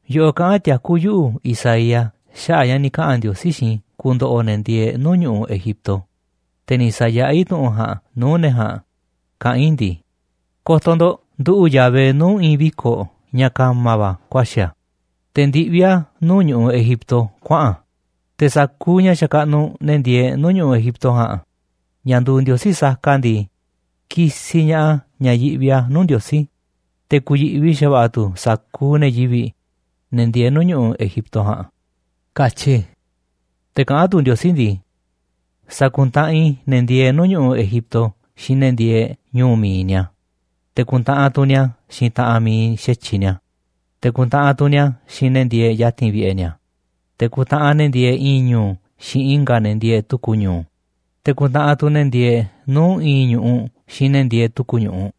Yoꞌoꞌ kaꞌán tiakú yuꞌu̱, Isaías, xaꞌa̱ꞌ ña̱ ni̱ kaꞌa̱n Ndiosí xiinꞌ i̱ ku̱ndo̱ꞌo̱ ne̱ ndieeꞌ nuu̱ꞌ ñu̱ꞌuꞌ Egipto, te̱ ni̱ sa̱yaꞌá i̱ tu̱ꞌu̱n ja̱a̱nꞌ nuu̱ꞌ ne̱ ja̱a̱nꞌ kaꞌán i̱ ndii: “Ko̱to̱ ndo̱ꞌ, nduꞌu̱ꞌ Yahvé nuu̱ꞌ i̱i̱n viko̱ꞌ ña̱ ka̱ma̱ va̱ ku̱a̱xi̱ a̱, te̱ ndiꞌví a̱ nuu̱ꞌ ñu̱ꞌuꞌ Egipto kuaꞌa̱n a̱. Te̱ sa̱kuuꞌ ña̱ xakaꞌnuꞌ ne̱ ndieeꞌ nuu̱ꞌ ñu̱ꞌuꞌ Egipto ja̱a̱nꞌ ña̱ nduuꞌ ndiosí saka ndii, ki̱si̱ ña̱ꞌaꞌ ña̱ yiꞌvi a̱ nuu̱ꞌ Ndiosí, te̱ ku̱yi̱ꞌvi xa̱va̱ꞌa̱ tu̱ sa̱kuuꞌ ne̱ yivi̱ꞌ, ne̱ ndieeꞌ nuu̱ꞌ ñu̱ꞌuꞌ Egipto ja̱a̱nꞌ”, katyi i̱. Te̱ kaꞌán tu̱ Ndiosí ndii: “Sa̱ku̱ntaꞌanꞌ i̱ ne̱ ndieeꞌ nuu̱ꞌ ñu̱ꞌuꞌ Egipto xiinꞌ ne̱ ndieeꞌ ñu̱u̱ mi̱iꞌ ni̱a̱, te̱ ku̱ntaꞌanꞌ tu̱ ni̱a̱ xiinꞌ taꞌanꞌ mi̱iꞌ xa̱tyiꞌ ni̱a̱, te̱ ku̱ntaꞌanꞌ tu̱ ni̱a̱ xiinꞌ ne̱ ndieeꞌ ya̱ti̱n vi̱ꞌe̱ ni̱a̱, te̱ ku̱ntaꞌanꞌ ne̱ ndieeꞌ i̱i̱n ñu̱u̱ xiinꞌ i̱nga̱ ne̱ ndieeꞌ tu̱ku̱ ñu̱u̱, te̱ ku̱ntaꞌanꞌ tu̱ ne̱ ndieeꞌ nuu̱ꞌ i̱i̱n ñu̱ꞌuꞌ xiinꞌ ne̱ ndieeꞌ tu̱ku̱ ñu̱ꞌuꞌ.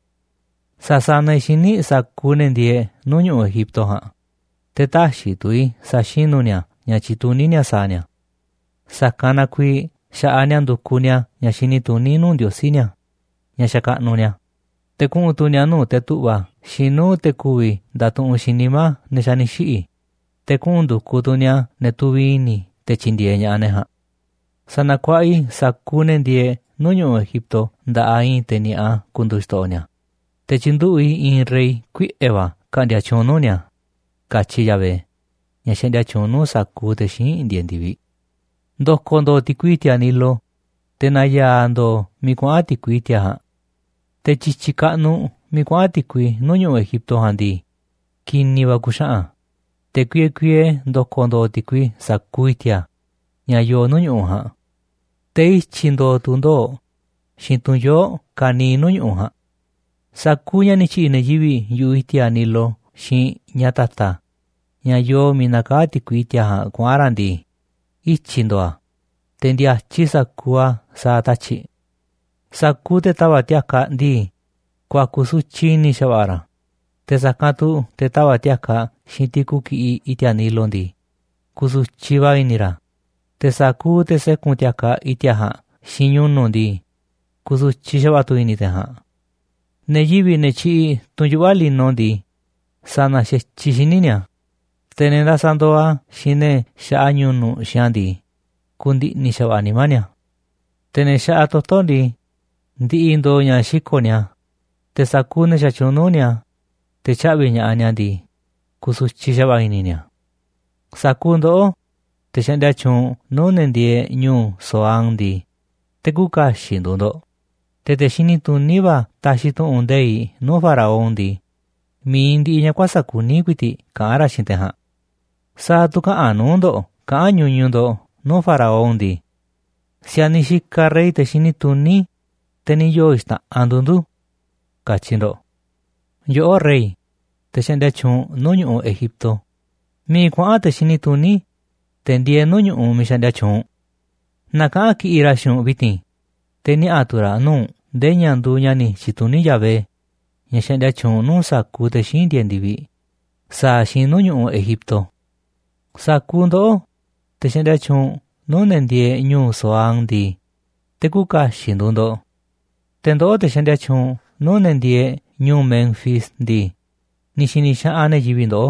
Sa̱sanaꞌ i̱ xíniꞌ sa̱kuuꞌ ne̱ ndieeꞌ nuu̱ꞌ ñu̱ꞌuꞌ Egipto ja̱a̱nꞌ, te̱ tä̱xi̱ tu̱ i̱ sa̱xinu̱ ni̱a̱ ña̱ tyituní ni̱a̱ sa̱a̱ ni̱a̱. Sa̱kanꞌ na kuiiꞌ xa̱ꞌaꞌ ni̱a̱ ndu̱kuꞌ ni̱a̱ ña̱ xini tuní nuu̱ꞌ ndiosí ni̱a̱, ña̱ xakaꞌnuꞌ ni̱a̱, te̱ kuꞌu̱n tu̱ ni̱a̱ nuu̱ꞌ te̱ tu̱ꞌva̱ xiinꞌ nuu̱ꞌ ne̱ ku̱vi̱ ndatuꞌunꞌ xiinꞌ nimá ne̱ xa̱ ni̱ xiꞌi̱, te̱ kuꞌu̱n ndu̱kuꞌ tu̱ ni̱a̱ ne̱ tuviꞌ i̱ni̱ te̱ tyi̱ndi̱e̱eꞌ ña̱ꞌaꞌ ne̱ ja̱a̱nꞌ. Sa̱na̱kuaꞌa i̱ sa̱kuuꞌ ne̱ ndieeꞌ nuu̱ꞌ ñu̱ꞌuꞌ Egipto nda̱ꞌaꞌ i̱i̱n te̱ ni̱a̱ꞌa ku̱ndu̱u̱ xto̱ꞌo̱ ni̱a̱, te̱ tyi̱nduꞌu̱ꞌ i̱ i̱i̱n rey kuiꞌe̱ va̱ ka̱ꞌndi̱a̱ tyuunꞌ nuu̱ꞌ ni̱a̱”, katyi Yahvé, ña̱ xaꞌndia tyuunꞌ nuu̱ꞌ sa̱kuuꞌ te̱ xíinꞌ ndieeꞌ ndi̱viꞌ. Ndo̱ko̱ ndo̱o̱ ti̱kui i̱ti̱a̱ Nilo, te̱ na̱ya̱a̱ ndo̱o̱ miiꞌ kuaꞌa̱n ti̱kui i̱ti̱a̱ ja̱a̱nꞌ. Te̱ tyi̱tyi̱ kaꞌnuꞌ miiꞌ kuaꞌa̱n ti̱kui nuu̱ꞌ ñu̱ꞌuꞌ Egipto ja̱a̱nꞌ ndii, ki̱ni̱ va̱ ku̱xaꞌa̱n a̱, te̱ kuiee kuiee ndo̱ko̱ ndo̱o̱ ti̱kui sa̱kuuꞌ i̱ti̱a̱ ña̱ yoo nuu̱ꞌ ñu̱ꞌuꞌ ja̱a̱nꞌ. Te̱ ityi̱ ndo̱o̱ tu̱ ndoo̱ꞌ xiinꞌ tunꞌ yoo̱ꞌ ka̱niiꞌ nuu̱ꞌ ñu̱ꞌuꞌ ja̱a̱nꞌ. Sa̱kuuꞌ ña̱ ni̱ tyi̱ꞌi̱ ne̱ yivi̱ꞌ yu̱ꞌuꞌ i̱ti̱a̱ Nilo xiinꞌ ña̱ ta̱ta̱ ña̱ yoo miiꞌ nakaá ti̱kui i̱ti̱a̱ ja̱a̱nꞌ kuaꞌa̱n raꞌ ndii, ityi̱ ndo̱o̱ a̱, te̱ ndi̱a̱tyiꞌ sa̱kuuꞌ a̱ sa̱a̱ tatyi̱ꞌ. Sa̱kuuꞌ te̱ tava̱ꞌ ti̱a̱kaꞌ ndii, ku̱a̱ku̱ sutyiꞌ i̱ni̱ xa̱va̱ꞌa̱ ra̱, te̱ sa̱kanꞌ tu̱ te̱ tava̱ꞌ ti̱a̱kaꞌ xiinꞌ tiku ki̱ꞌiꞌ i̱ti̱a̱ Nilo ndii, ku̱su̱tyiꞌ va̱ i̱ni̱ ra̱, te̱ sa̱kuuꞌ te̱ sékun ti̱a̱kaꞌ i̱ti̱a̱ ja̱a̱nꞌ xiinꞌ ñu̱nu̱ꞌ ndii, ku̱su̱tyiꞌ xa̱va̱ꞌa̱ tu̱ i̱ni̱ te̱ ja̱a̱nꞌ. Ne̱ yivi̱ꞌ, ne̱ tyiꞌiꞌ tunꞌ yuꞌva̱ lino ndii, sa̱na̱ xa̱tyiꞌ xíniꞌ ni̱a̱, te̱ ne̱ ndasaꞌ ndooꞌ a̱ xiinꞌ ne̱ xaꞌa ñu̱nu̱ꞌ xiinꞌ a̱ ndii, ku̱ndi̱ꞌni̱ xa̱va̱ꞌa̱ nimá ni̱a̱. Te̱ ne̱ xaꞌa toto̱ ndii, ndi̱ꞌi̱ ndo̱o̱ ña̱ xiko̱ꞌ ni̱a̱, te̱ sa̱kuuꞌ ne̱ xatyuunꞌ nuu̱ꞌ ni̱a̱, te̱ tyaꞌvi̱ ña̱ꞌaꞌ ni̱a̱ ndii, ku̱su̱tyiꞌ xa̱va̱ꞌa̱ i̱ni̱ ni̱a̱. Sa̱kuuꞌ ndoꞌó, te̱ xaꞌndia tyuunꞌ nuu̱ꞌ ne̱ ndieeꞌ ñu̱u̱ Zoán ndii, te̱ küuꞌ kaxiꞌ nduuꞌ ndo̱ꞌ. Te̱ te̱ xini tuní va̱ taxiꞌ tu̱ꞌu̱n nde̱iꞌ nuu̱ꞌ faraón ndii, mi̱iꞌ ndiꞌiꞌ ña̱ kuäsa̱ꞌ kuní ku̱i̱ti̱ꞌ kaꞌán ra̱ xiinꞌ te̱ ja̱a̱nꞌ. ¿Sa̱a̱ tu̱ käꞌanꞌ nuu̱ꞌ ndo̱ꞌ kaꞌán ñuñuꞌ ndo̱ꞌ nuu̱ꞌ faraón ndii: “Si̱a̱niꞌ xikaꞌ rey te̱ xini tuní, te̱ ni̱ yoo̱ xta̱ꞌanꞌ nduuꞌ ndu̱”, katyi ndo̱ꞌ? Yoꞌó, rey, te̱ xaꞌndia tyuunꞌ nuu̱ꞌ ñu̱ꞌuꞌ Egipto, ¿miiꞌ kuaꞌa̱n te̱ xini tuní, te̱ ndieeꞌ nuu̱ꞌ ñu̱ꞌuꞌ miiꞌ xaꞌndia tyuunꞌ u̱nꞌ? Na kaꞌa̱n kiꞌi̱ꞌ ra̱ xiinꞌ u̱nꞌ vi̱ti̱n, te̱ niaꞌa̱ tu̱ ra̱ nuu̱ꞌ u̱nꞌ nde̱e̱ ña̱ nduuꞌ ña̱ ni̱ tyi̱tuní Yahvé, ña̱ xaꞌndia tyuunꞌ nuu̱ꞌ sa̱kuuꞌ te̱ xíinꞌ ndieeꞌ ndi̱viꞌ, sa̱a̱ a̱ xiinꞌ nuu̱ꞌ ñu̱ꞌuꞌ Egipto. Sa̱kuuꞌ ndoꞌó, te̱ xaꞌndia tyuunꞌ nuu̱ꞌ ne̱ ndieeꞌ ñu̱u̱ Zoán ndii, te̱ küuꞌ kaxiꞌ nduuꞌ ndo̱ꞌ. Te̱ ndoꞌó, te̱ xaꞌndia tyuunꞌ nuu̱ꞌ ne̱ ndieeꞌ ñu̱u̱ Menfis ndii, ni̱ xi̱ni̱ xaꞌanꞌ ne̱ yivi̱ꞌ ndoꞌó.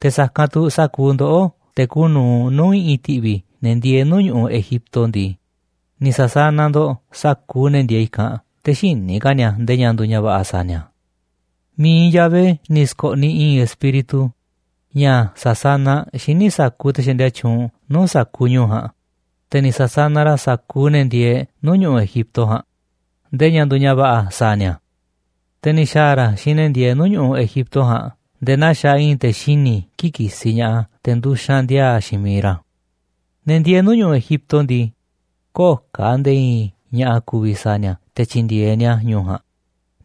Te̱ sa̱kanꞌ tu̱ sa̱kuuꞌ ndoꞌó, te̱ kuuꞌ nu̱uꞌ nuu̱ꞌ i̱ꞌi̱n ti̱ꞌvi̱ ne̱ ndieeꞌ nuu̱ꞌ ñu̱ꞌuꞌ Egipto ndii, ni̱ sa̱sanaꞌ ndo̱ꞌ sa̱kuuꞌ ne̱ ndieeꞌ i̱kanꞌ, te̱ xïni̱ ka̱ ni̱a̱ nde̱e̱ ña̱ nduuꞌ ña̱ va̱ꞌa̱ sa̱a̱ ni̱a̱. Mi̱iꞌ Yahvé ni̱ sko̱ꞌniꞌ i̱i̱n espíritu ña̱ sa̱sanaꞌ xíniꞌ sa̱kuuꞌ te̱ xaꞌndia tyuunꞌ nuu̱ꞌ sa̱kuuꞌ ñu̱u̱ ja̱a̱nꞌ, te̱ ni̱ sa̱sanaꞌ ra̱ sa̱kuuꞌ ne̱ ndieeꞌ nuu̱ꞌ ñu̱ꞌuꞌ Egipto ja̱a̱nꞌ ndee ña̱ nduuꞌ ña̱ va̱ꞌa̱ sa̱a̱ ni̱a̱. Te̱ ni̱ xa̱a̱ ra̱ xiinꞌ ne̱ ndieeꞌ nuu̱ꞌ ñu̱ꞌuꞌ Egipto ja̱a̱nꞌ nde̱e̱ naa xaaꞌ i̱i̱n te̱ xini̱ kii̱ꞌ kisiꞌ ña̱ꞌaꞌ a̱ te̱ nduxanꞌ ndi̱a̱a̱ xiinꞌ miiꞌ ra̱. Ne̱ ndieeꞌ nuu̱ꞌ ñu̱ꞌuꞌ Egipto ndii, köo̱ꞌ ka̱ nde̱e̱ i̱i̱n ña̱ꞌa̱ ku̱vi̱ sa̱a̱ ni̱a̱ te̱ tyi̱ndi̱e̱eꞌ ni̱a̱ ñu̱u̱ ja̱a̱nꞌ,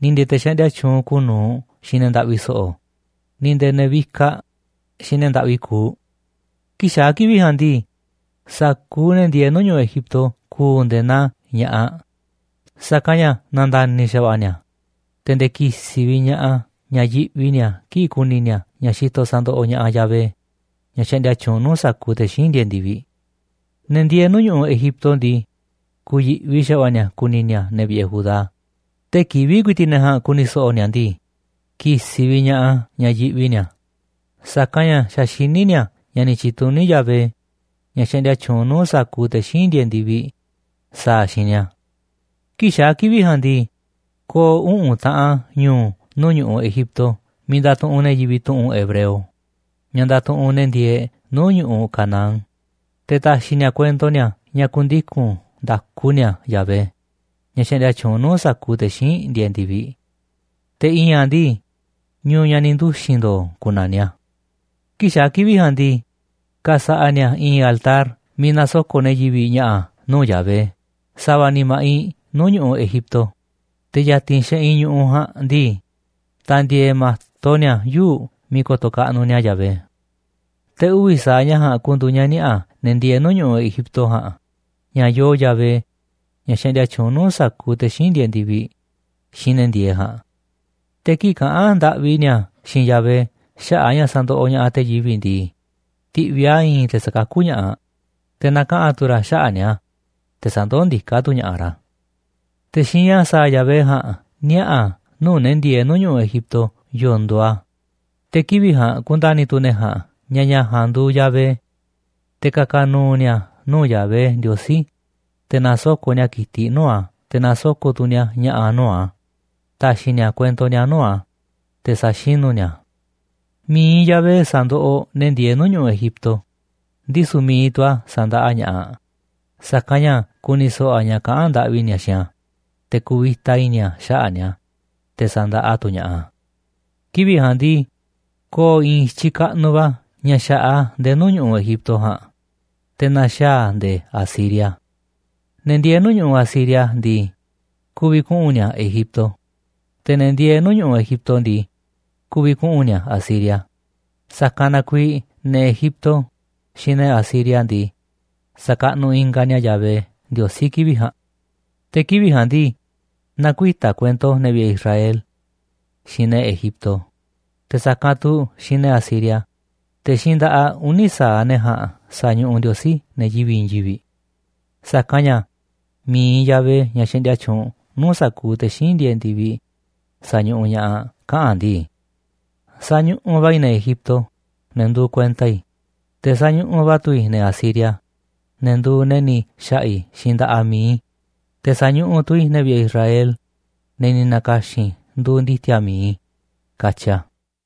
ni̱ nde̱e̱ te̱ xaꞌndia tyuunꞌ kuuꞌ nu̱uꞌ xiinꞌ ne̱ ndaꞌvi so̱ꞌo̱, ni̱ nde̱e̱ ne̱ vikaꞌ xiinꞌ ne̱ ndaꞌvi kuuꞌ. Kii̱ꞌ xaa̱ kivi̱ꞌ ja̱a̱nꞌ ndii, sa̱kuuꞌ ne̱ ndieeꞌ nuu̱ꞌ ñu̱ꞌuꞌ Egipto ku̱u̱ nde̱e̱ naa ña̱ꞌaꞌ, sa̱kanꞌ ña̱ na̱nda̱ni̱ xa̱va̱ꞌa̱ ni̱a̱, te̱ nde̱e̱ ki̱si̱ vi̱ꞌ ña̱ꞌaꞌ a̱ ña̱ yiꞌvi ni̱a̱ kii̱ꞌ ku̱ni̱ ni̱a̱ ña̱ xitoꞌ sa̱ndoꞌoꞌ ña̱ꞌaꞌ Yahvé, ña̱ xaꞌndia tyuunꞌ nuu̱ꞌ sa̱kuuꞌ te̱ xíinꞌ ndieeꞌ ndi̱viꞌ. Ne̱ ndieeꞌ nuu̱ꞌ ñu̱ꞌuꞌ Egipto ndii, ku̱yi̱ꞌvi xa̱va̱ꞌa̱ ni̱a̱ ku̱ni̱ ni̱a̱ ne̱ vi̱ꞌe̱ Judá. Tee̱ꞌ kivi̱ꞌ ku̱i̱ti̱ꞌ ne̱ ja̱a̱nꞌ ku̱ni̱ so̱ꞌo̱ ni̱a̱ ndii, ki̱si̱ vi̱ꞌ ña̱ꞌaꞌ a̱ ña̱ yiꞌvi ni̱a̱, sa̱kanꞌ ña̱ xa̱ xiní ni̱a̱ ña̱ ni̱ tyi̱tuní Yahvé, ña̱ xaꞌndia tyuunꞌ nuu̱ꞌ sa̱kuuꞌ te̱ xíinꞌ ndieeꞌ ndi̱viꞌ, sa̱a̱ a̱ xiinꞌ ni̱a̱. Kii̱ꞌ xaa̱ kivi̱ꞌ ja̱a̱nꞌ ndii, ko̱o̱ uꞌu̱n taꞌan ñu̱u̱ nuu̱ꞌ ñu̱ꞌuꞌ Egipto miiꞌ ndatuꞌunꞌ ne̱ yivi̱ꞌ tu̱ꞌu̱n hebreo, ña̱ ndatuꞌunꞌ ne̱ ndieeꞌ nuu̱ꞌ ñu̱ꞌuꞌ Canaán. Te̱ ta̱xi̱ ni̱a̱ kuento ni̱a̱ ña̱ ku̱ndiku̱n nda̱ku ni̱a̱ Yahvé, ña̱ xaꞌndia tyuunꞌ nuu̱ꞌ sa̱kuuꞌ te̱ xíinꞌ ndieeꞌ ndi̱viꞌ. Te̱ i̱i̱n a̱ ndii, Ñu̱u̱ Ña̱ Ni̱ Nduxi̱n Ndo̱o̱ ku̱na̱niꞌ a̱. Kii̱ꞌ xaa̱ kivi̱ꞌ ja̱a̱nꞌ ndii, ka̱sa̱ꞌa̱ ni̱a̱ i̱i̱n altar miiꞌ na̱soko̱ꞌ ne̱ yivi̱ꞌ ña̱ꞌa̱ nuu̱ꞌ Yahvé sa̱va̱ ni̱ ma̱ꞌiꞌ nuu̱ꞌ ñu̱ꞌuꞌ Egipto, te̱ ya̱ti̱n xeꞌinꞌ ñu̱ꞌuꞌ ja̱a̱nꞌ ndii, ta̱ndi̱e̱e̱ ma̱to ni̱a̱ yuu̱ꞌ miiꞌ ko̱to̱ kaꞌnuꞌ ni̱a̱ Yahvé. Te̱ uvi̱ sa̱aꞌ ña̱ ja̱a̱nꞌ ku̱ndu̱u̱ ña̱ niaꞌa̱ ne̱ ndieeꞌ nuu̱ꞌ ñu̱ꞌuꞌ Egipto ja̱a̱nꞌ ña̱ yoo Yahvé, ña̱ xaꞌndia tyuunꞌ nuu̱ꞌ sa̱kuuꞌ te̱ xíinꞌ ndieeꞌ ndi̱viꞌ, xiinꞌ ne̱ ndieeꞌ ja̱a̱nꞌ. Te̱ kii̱ꞌ kaꞌa̱n ndaꞌvi ni̱a̱ xiinꞌ Yahvé xaꞌa̱ꞌ a̱ ña̱ sandoꞌoꞌ ña̱ꞌaꞌ te̱ yivi̱ꞌ ndii, ti̱ꞌviꞌ a̱ i̱i̱n te̱ sa̱kakú ña̱ꞌaꞌ, te̱ na̱kaꞌa̱n tu̱ ra̱ xaꞌa̱ꞌ ni̱a̱, te̱ sa̱ndoó ndiká tu̱ ña̱ꞌaꞌ ra̱. Te̱ xiinꞌ ña̱ sa̱a̱ Yahvé ja̱a̱nꞌ niaꞌa̱ a̱ nuu̱ꞌ ne̱ ndieeꞌ nuu̱ꞌ ñu̱ꞌuꞌ Egipto yo̱o̱ nduuꞌ a̱, te̱ kivi̱ꞌ ja̱a̱nꞌ ku̱nda̱ni̱ tu̱ ne̱ ja̱a̱nꞌ ña̱ ña̱ ja̱a̱nꞌ nduuꞌ Yahvé. Te̱ ka̱ka̱ nu̱u̱ ni̱a̱ nuu̱ꞌ Yahvé Ndiosí, te̱ na̱soko̱ꞌ ni̱a̱ ki̱tiꞌ nuu̱ꞌ a̱, te̱ na̱soko̱ꞌ tu̱ ni̱a̱ ña̱ꞌa̱ nuu̱ꞌ a̱ ta̱xi̱ ni̱a̱ kuento ni̱a̱ nuu̱ꞌ a̱, te̱ sa̱xinu̱ ni̱a̱ a̱. Mi̱iꞌ Yahvé sa̱ndoꞌoꞌ ne̱ ndieeꞌ nuu̱ꞌ ñu̱ꞌuꞌ Egipto, ndisu̱ mi̱iꞌ tu̱ a̱ sa̱ndaꞌa ña̱ꞌaꞌ, sa̱kanꞌ ña̱ ku̱ni̱ so̱ꞌo̱ a̱ ña̱ kaꞌán ndaꞌvi ni̱a̱ xiinꞌ a̱, te̱ ku̱vi̱ta i̱ni̱ a̱ xaꞌa̱ꞌ ni̱a̱, te̱ sandaꞌa tu̱ ña̱ꞌaꞌ a̱. Kivi̱ꞌ ja̱a̱nꞌ ndii, ko̱o̱ i̱i̱n i̱tyiꞌ kaꞌnuꞌ va̱ ña̱ xa̱ꞌaꞌ a̱ nde̱e̱ nuu̱ꞌ ñu̱ꞌuꞌ Egipto ja̱a̱nꞌ, te̱ na̱xaa̱ a̱ nde̱e̱ Asiria. Ne̱ ndieeꞌ nuu̱ꞌ ñu̱ꞌuꞌ Asiria ndii, ku̱vi̱ kuꞌu̱n ni̱a̱ Egipto, te̱ ne̱ ndieeꞌ nuu̱ꞌ ñu̱ꞌuꞌ Egipto ndii, ku̱vi̱ kuꞌu̱n ni̱a̱ Asiria, sa̱kanꞌ na kuiiꞌ ne̱ Egipto xiinꞌ ne̱ Asiria ndii, sa̱kaꞌnuꞌ ingaꞌ ni̱a̱ Yahvé Ndiosí kivi̱ꞌ ja̱a̱nꞌ. Te̱ kivi̱ꞌ ja̱a̱nꞌ ndii, na̱kuita̱ kuento ne̱ vi̱ꞌe̱ Israel xiinꞌ ne̱ Egipto, te̱ sa̱kanꞌ tu̱ xiinꞌ ne̱ Asiria, te̱ xiinꞌ nda̱ꞌaꞌ uni̱ sa̱aꞌ ne̱ ja̱a̱nꞌ sa̱ñuꞌuꞌ Ndiosí ne̱ yivi̱ꞌ i̱i̱n yivi̱ꞌ. Sa̱kanꞌ ña̱ mi̱iꞌ Yahvé, ña̱ xaꞌndia tyuunꞌ nuu̱ꞌ sa̱kuuꞌ te̱ xíinꞌ ndieeꞌ ndi̱viꞌ, sa̱ñuꞌuꞌ ña̱ꞌaꞌ kaꞌa̱n a̱ ndii: “Sañuꞌuꞌ va̱ i̱ ne̱ Egipto, ne̱ nduuꞌ kuenta i̱, te̱ sañuꞌuꞌ va̱ tu̱ i̱ ne̱ Asiria, ne̱ nduuꞌ ne̱ ni̱ xa̱ꞌa̱ i̱ xiinꞌ nda̱ꞌaꞌ mi̱iꞌ i̱, te̱ sa̱ñuꞌuꞌ tu̱ i̱ ne̱ vi̱ꞌe̱ Israel, ne̱ ni̱ na̱ka̱xi̱n i̱ nduuꞌ ndi̱ti̱a̱ mi̱iꞌ i̱”, katyi a̱.